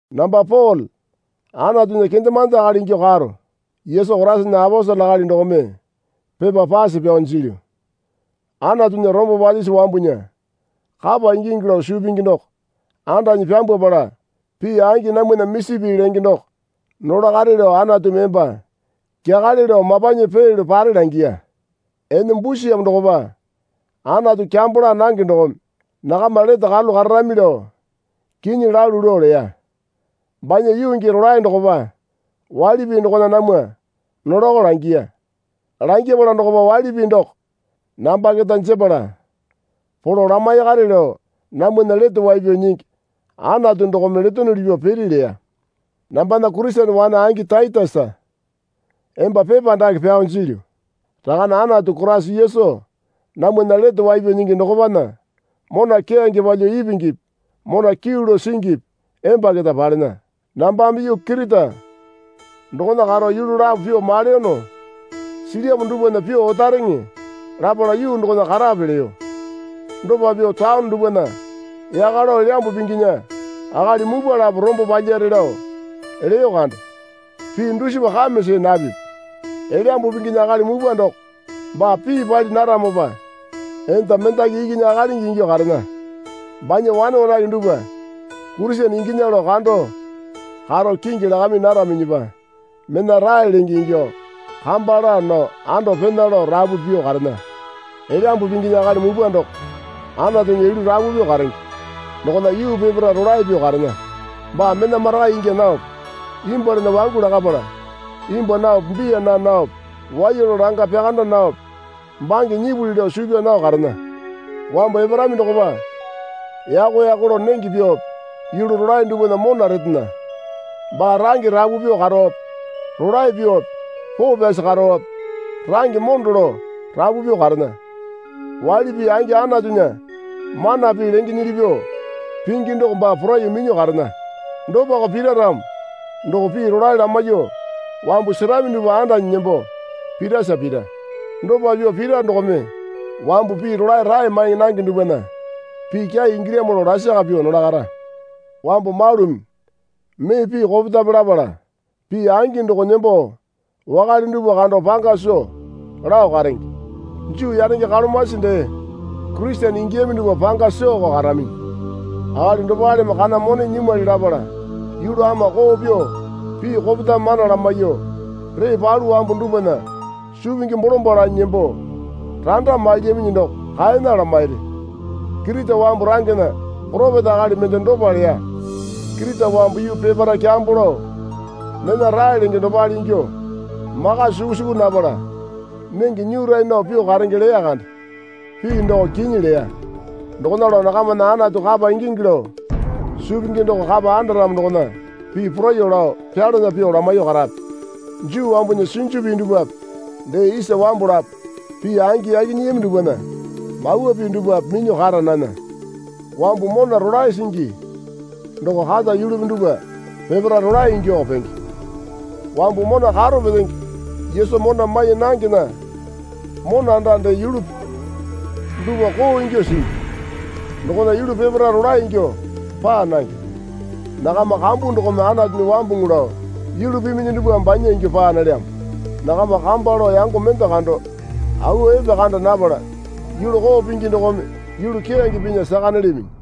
Namba Pole Anatunya kendemande akali ingyuo karo Yesu Koraisana aposele akali dokome pepa pase pyao jilyu. Anatunya rombo palyisi wambunya kapa ingingi lao suu pingi doko andanyi pyambwapala pii angi namwana misi pii lenge doko nolakare lao Anatumi emba kyakale lao mapanyi peelyo pare langiya. Ene busiyamo dokopa Anatu kyambo laa nange dokome nakama lete karalu kararami lao kinyi lalu lao leya. Banya yuu gii rolae dokopa waili pii dokona namwa nolako langiya. Langyapala dokopa waili pii doko namba keta jepala polo lamaikare lao namwana Lete Wai Pyao Nyingi Anatu dokome letonuli pyuo piri leya. Nambana Kurisene wane angi Taitesa emba pepa dake pyao jilyu. Rakane Anatu Koraisa Yesu namwana Lete Wai Pyao Nyingi dokopana mona keyange palyuo ipingipi mona kyuu lao singipi emba keta palena. Nambame yuu Kirita dokona karo yulu lapo pyuo maleyono silyamo dupwana pyuo otakareŋe lapala yuu dokona karape leyo. Dopa pyuo taone dupwana yaka lao Elyambu Pinginya akali mupwa lapo rombo palyare lao leyo kande. Pii dusipa kame see napipi. Elyambu Pinginya akali mupwa doko baa pii pali naramopa enda mendaki ikinya akalingi ingyuo karena. Banya wane wanake dupwa Kurisene inginya lao kando karo kingi lakami naraminyipa mena rae lenge ingyuo kamba laa nao ando pena lao rapu pyuo karena. Elyambu Pinginya akali mupwa doko Anatunya yulu rapu pyuo karenge dokona yuu peparae rolae pyuo karena. Baa mena marakai ingya naope imbwualana wangu lakapala imbwua naope biya naa naope waiya lao langa pyakanda naope bange nyipuli lao suu pyaa nao karena. Wambu eparami dokopa yako yako lao nenge pyuope yulu rolae dupwana mona retena. Baa range rapu pyuo karope rolae pyuope poo pyasi karope rangeme mondo lao rapu pyuo karena. Waili pii angi Anatunya mana pii lengenyili pyuo pingi doko baa poraiyuo minyuo karena. Dopako pira ramo doko pii rolae lamaiyuo wambu serami dupwa andanyi nembo pirasa pira. Dopa pyuo pira dokome wambu pii rolae rae mai nange dupwana pii kyai ingilyamo lao lasaka pyuo nolakara. Wambu malumi mee pii kopetame lapala pii angi doko nembo wakale dupwa kando panga soo lao karenge. Juu yanenge kalomasi dee Kurisene ingiyami dupwa panga sooko karaminyi. Akali dopaleme kana mone nyimwali lapala yulu ama koo pyuo pii kopetame mana lamaiyuo ree palu wambu dupwana suu pingi bolombalo lanyi nembo randa mailyaminyi doko kaena lamairi. Kirita wambu rangena poropeta akali mende dopa leya. Kirita wambu yuu peparae kyambo lao mena rae lenge dopale ingyuo maka suku suku napala nenge nyura nao pyuo karenge leya kande. Pii doko kinyi leya. Dokona lao nakamana Anatu kapa ingingi lao suu pingi doko kapa andaramo dokona pii poraiyuo lao pyalana pyuo lamaiyuo karape. Juu wambunya sinju pii dupwape dee isa wambu lapo pii angi yaki nyiyami dupwana mawa pii dupwape minyuo kara nana. Wambu mona rolae singi doko kata yulupi dupwa peparae rolae ingyuoko penge. Wambu mona karo petenge Yesu mona mai nangena mona anda dee yulupi dupwa koo ingyuo singi dokona yulu peparae rolae ingyuo paa nange. Nakama kambu dokome Anatunya wambuŋu lao yulu piminyi dupwame banya ingyuo paa nalyamo. Nakama kamba lao yango mende kando awa epekanda napala yulu koo pingi dokome yulu keyange pinya saka nalyaminyi.